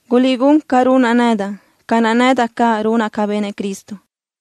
Guliʼgún ca runaʼ nedaʼ, ca naʼ nedaʼ caʼ runaʼ ca benëʼ Cristo.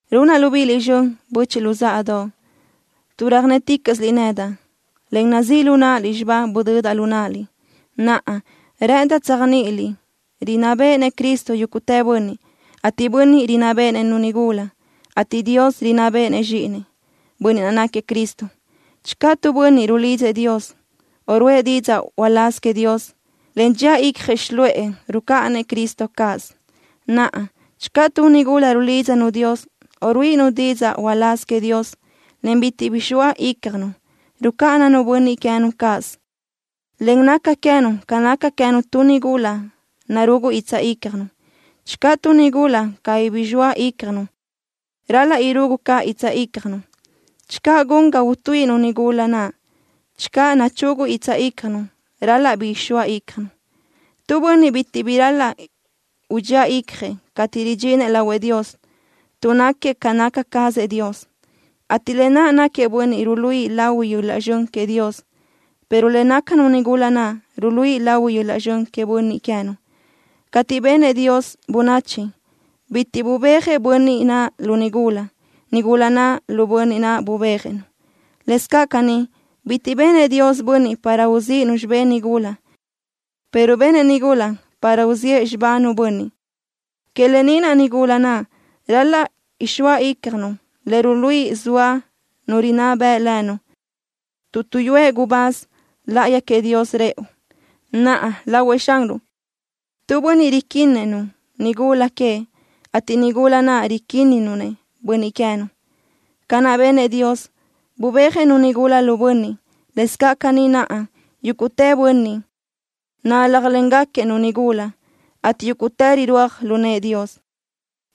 Runaʼ libíʼiliʼ zxön, böchiʼ luzáʼadoʼ, tuʼ röjnéticaʼsiliʼ nedaʼ, en nazíʼ lu náʼaliʼ xibá budödaʼ lu náʼaliʼ. Naʼa, rë́ʼëndaʼ tséajniʼiliʼ rinná béʼenëʼ Cristo yúguʼtë bönniʼ, ateʼ bönniʼ rinná béʼenëʼ-nu nigula, ateʼ Dios rinná béʼenëʼ Zxíʼinëʼ, Bönniʼ naʼ náquiëʼ Cristo. Channö tu bönniʼ rulidzëʼ Dios, o ruʼë didzaʼ uláz queëʼ Dios, en dxía icjëʼ xiluʼë, rucáʼanëʼ Cristo cáʼasö. Naʼa, channö tu nigula rulídzanu Dios, o ruíʼinu didzaʼ uláz queëʼ Dios, en bitiʼ bi zxoa ícjanu, rucáʼananu bönniʼ queë́nu cáʼasö, en naca queë́nu ca naca queë́nu tu nigula narugu guitsaʼ ícjanu. Channö tu nigula cabí bi zxoa ícjanu, ral-laʼ irugu caʼ guitsaʼ ícjanu. Channö gun ga utuíʼinu nigula naʼ channö nu chugu guitsaʼ ícjanu, ral-laʼ bi ixóa ícjanu. Tu bönniʼ bitiʼ bi ral-laʼ udxía icjëʼ cateʼ ridxinëʼ lahuëʼ Dios, tuʼ náquiëʼ ca naca cazëʼ Dios, ateʼ lë naʼ náquiëʼ bönniʼ ruluíʼi lahui yöl-laʼ zxön queëʼ Dios, pero le nácanu nigula naʼ ruluíʼi lahui yöl-laʼ zxön queëʼ bönniʼ queë́nu. Cateʼ benëʼ Dios bönachi, bitiʼ bubéajëʼ bönniʼ naʼ lu nigula. Nigula naʼ, lu bönniʼ naʼ bubéajëʼ-nu. Lëscaʼ caní, bitiʼ benëʼ Dios bönniʼ para uzíʼinu xibë́ʼ nigula, pero benëʼ nigula para uziʼë xibánu bönniʼ. Que lë ni naʼ, nigula naʼ ral-laʼ ixóa ícjanu le ruluíʼi zoa nu rinná beʼe lënu tuʼ tuʼyúëʼ gubáz láʼayi queëʼ Dios rëʼu. Naʼa, lahuëʼ Xanruʼ, tu bönniʼ riquinnëʼ-nu nigula queëʼ, ateʼ nigula naʼ riquíninu-nëʼ bönniʼ queë́nu. Ca naʼ benëʼ Dios, bubéajëʼ-nu nigula lu bönniʼ, lëscaʼ caní naʼa, yúguʼtë bönniʼ náljlengaquiëʼ-nu nigula, ateʼ yúguʼtë rirúaj lu nëʼë Dios.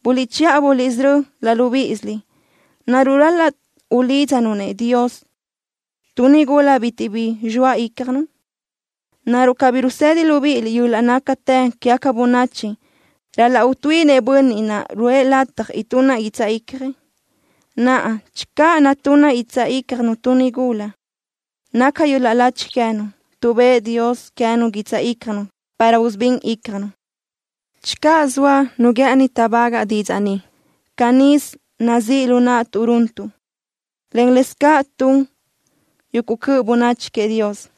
Buliʼchiʼa buliʼsörö́ laʼ libíʼisiliʼ. ¿Naruʼ ral-laʼ ulídzanu-nëʼ Dios tu nigula bitiʼ bi zxoa ícjanu? ¿Naruʼ cabí rusëdi libíʼiliʼ yöl-laʼ nácatë quégaca bönachi, ral-laʼ utuíʼinëʼ bönniʼ naʼ ruʼë lataj itunna guitsaʼ icjëʼ? Naʼa, channö natúnna guitsaʼ ícjanu tu nigula, naca yöl-laʼ lachi queë́nu, tuʼ bëʼë Dios queë́nu guitsaʼ ícjanu para usubín ícjanu. Channö zoa nu guë́ʼëni táʼbagaʼ didzaʼ ni, canísö nazíʼ lu naʼtuʼ runtuʼ, en lë́bisö tun yuguʼ cöʼ bönachi queëʼ Dios.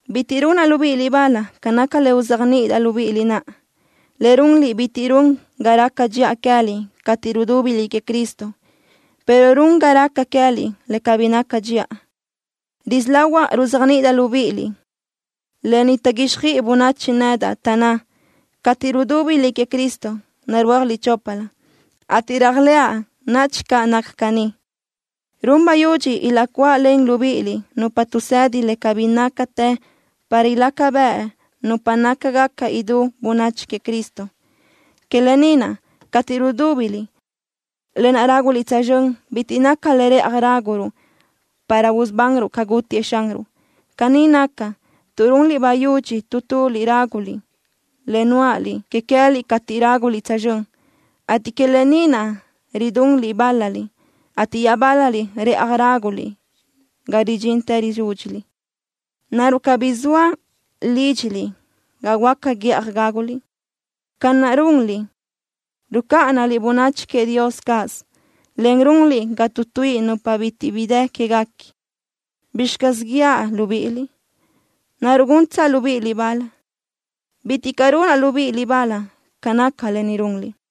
Bitiʼ runaʼ libíʼiliʼ bal ca naca le uzéajniʼidaʼ libíʼiliʼ naʼa. Le runliʼ bitiʼ run ga raca dxiʼa queë́liʼ cateʼ rudúbiliʼ queëʼ Cristo, pero run ga raca queë́liʼ le cabí naca dxiʼa. Risí lahuaʼ ruzéajniʼidaʼ libíʼiliʼ lë ni taʼguíxjöiʼi bönachi nedaʼ, taʼnná: “Cateʼ rudúbiliʼ queëʼ Cristo, narúajliʼ choplö”, ateʼ réajlëʼa nadxi caʼ naca caní. Run bayudxi ilaʼcuáʼalen libíʼiliʼ nupa tuʼsedi le cabí nácatë para ilaca bëʼ nupa nácagaca idú bönachi queëʼ Cristo. Que lë ni naʼ, cateʼ rudúbiliʼ, lë naʼ ráguliʼ tsözxö́n bitiʼ naca le rëʼaj ráguruʼ para usubanruʼ ca gútiëʼ Xanruʼ. Caní naca, tuʼ runliʼ bayudxi tu tuliʼ ráguliʼ le nuáʼaliʼ que queë́liʼ cateʼ ráguliʼ tsözxö́n, ateʼ que lë ni naʼ ridunliʼ bál-laliʼ, ateʼ iaʼbál-laliʼ rëʼaj ráguliʼ ga ridxintë rizúdxiliʼ. ¿Naruʼ cabí zoa lídxiliʼ ga huáca guíʼaj gáguliʼ? Ca naʼ runliʼ, rucáʼanaliʼ bönachi queëʼ Dios cáʼasö, en runliʼ ga tuʼtuíʼi nupa bitiʼ bi dë quéguequi. ¿Bizxi caz guíaʼ libíʼiliʼ? ¿Naruʼ guntsaʼ libíʼiliʼ bal? Bitiʼ caʼ runaʼ libíʼiliʼ bal ca naca lë ni runliʼ.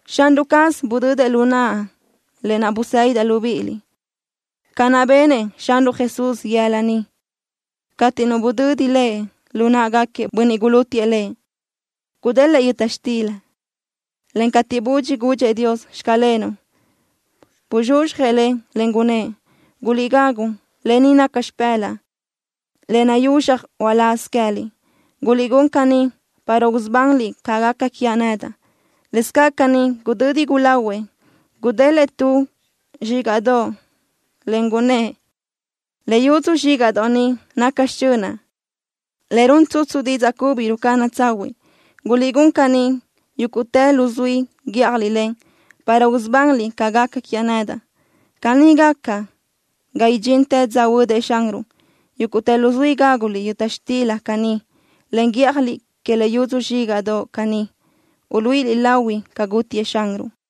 Xanruʼ caz budödëʼ lu naʼa lë naʼ busédidaʼ libíʼiliʼ, ca naʼ benëʼ Xanruʼ Jesús yëla niʼ cateʼ nu budödi Lëʼ lu náʼagaquiëʼ bönniʼ gulútiëʼ Lëʼ. Gudélëʼë yöta xtila, en cateʼ budxi gudxëʼ Dios: “Xclenuʼ”, buzxuzxjëʼ le, en gunnë́ʼ: “Guliʼgagu. Lë ni naca xipë́laʼa le nayuzxaj uláz queë́liʼ. Guliʼgún caní, para usubanliʼ ca gaca quiaʼ nedaʼ.” Lëscaʼ caní, gudödi gulahuëʼ, gudélëʼë tu zxígaʼdoʼ, en gunnë́ʼ: “Le yudzu zxígaʼdoʼ ni naca xichönaʼ, le run tsutsu didzaʼ cubi rucáʼana tsahuiʼ. Guliʼgún caní yúguʼtë luzuí guíʼjaliʼ le, para usubanliʼ ca gaca quiaʼ nedaʼ.” Caní gaca ga idxintë dza huödëʼ Xanruʼ. Yúguʼtë luzuí gáguliʼ yöta xtila caní, en guíʼjaliʼ que le yudzu zxígaʼdoʼ caní, uluíʼiliʼ lahui ca gútiëʼ Xanruʼ.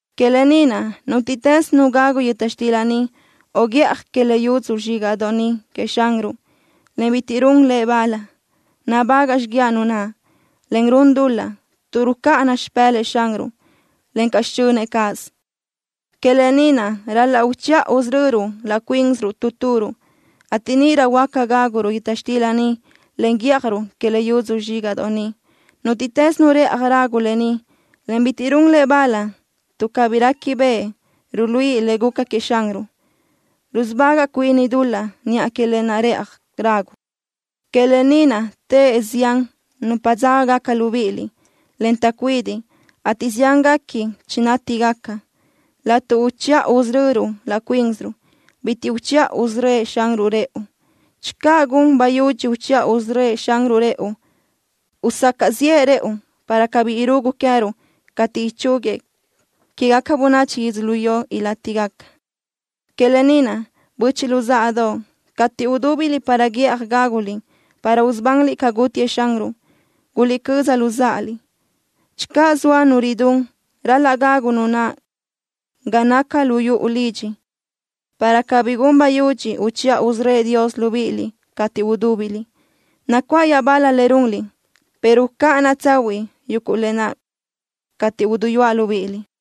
Que lë ni naʼ, nútiʼtës nu gagu yöta xtila ni o guíʼaj que le yudzu zxígaʼdoʼ ni queëʼ Xanruʼ, en bitiʼ run le bal, nabagaʼ xíguiaʼ nu naʼ, en run dul-laʼ, tuʼ rucáʼana xipë́lëʼë Xanruʼ, encaʼ xichönëʼ cáʼasö. Que lë ni naʼ, ral-laʼ uchiʼa usörö́ruʼ laʼ cuínsiruʼ tu turuʼ, ateʼ níʼirö huáca gáguruʼ yöta xtila ni, en guíʼajruʼ que le yudzu zxígaʼdoʼ ni. Nútiʼtës nu rëʼaj ragu lë ni, en bitiʼ run le bal tuʼ cabí réquibeʼe ruluíʼi le guca queëʼ Xanruʼ, rusubagaʼ cuini dul-laʼ niʼa que lë naʼ rëʼaj ragu. Que lë ni naʼ teʼe zián nupa dzágagaca libíʼiliʼ, en taʼcuídiʼ, ateʼ ziánguequi chinátigaca. Laʼtuʼ uchiʼa usörö́ruʼ laʼ cuínsiruʼ, bitiʼ uchiʼa usörö́ëʼ Xanruʼ rëʼu. Channö gun bayudxi uchiʼa usörö́ëʼ Xanruʼ rëʼu, usacaʼ ziʼë rëʼu, para cabí irugu queë́ruʼ cateʼ ichúguiëʼ quéguequi bönachi yödzölió ilátigaca. Que lë ni naʼ, böchiʼ luzáʼadoʼ, cateʼ udúbiliʼ para guíʼaj gáguliʼ para usubanliʼ ca gútiëʼ Xanruʼ, guliʼcöza luzáʼaliʼ. Channö zoa nu ridún, ral-laʼ gagu nu naʼ ga naca lu yuʼu lidxi, para cabí gun bayudxi uchiʼa usörö́ëʼ Dios libíʼiliʼ cateʼ udúbiliʼ. Nacuáʼ iaʼbal-la le runliʼ, pero ucáʼanaʼ tsahuiʼ yuguʼ lë naʼ cateʼ uduyúaʼ libíʼiliʼ.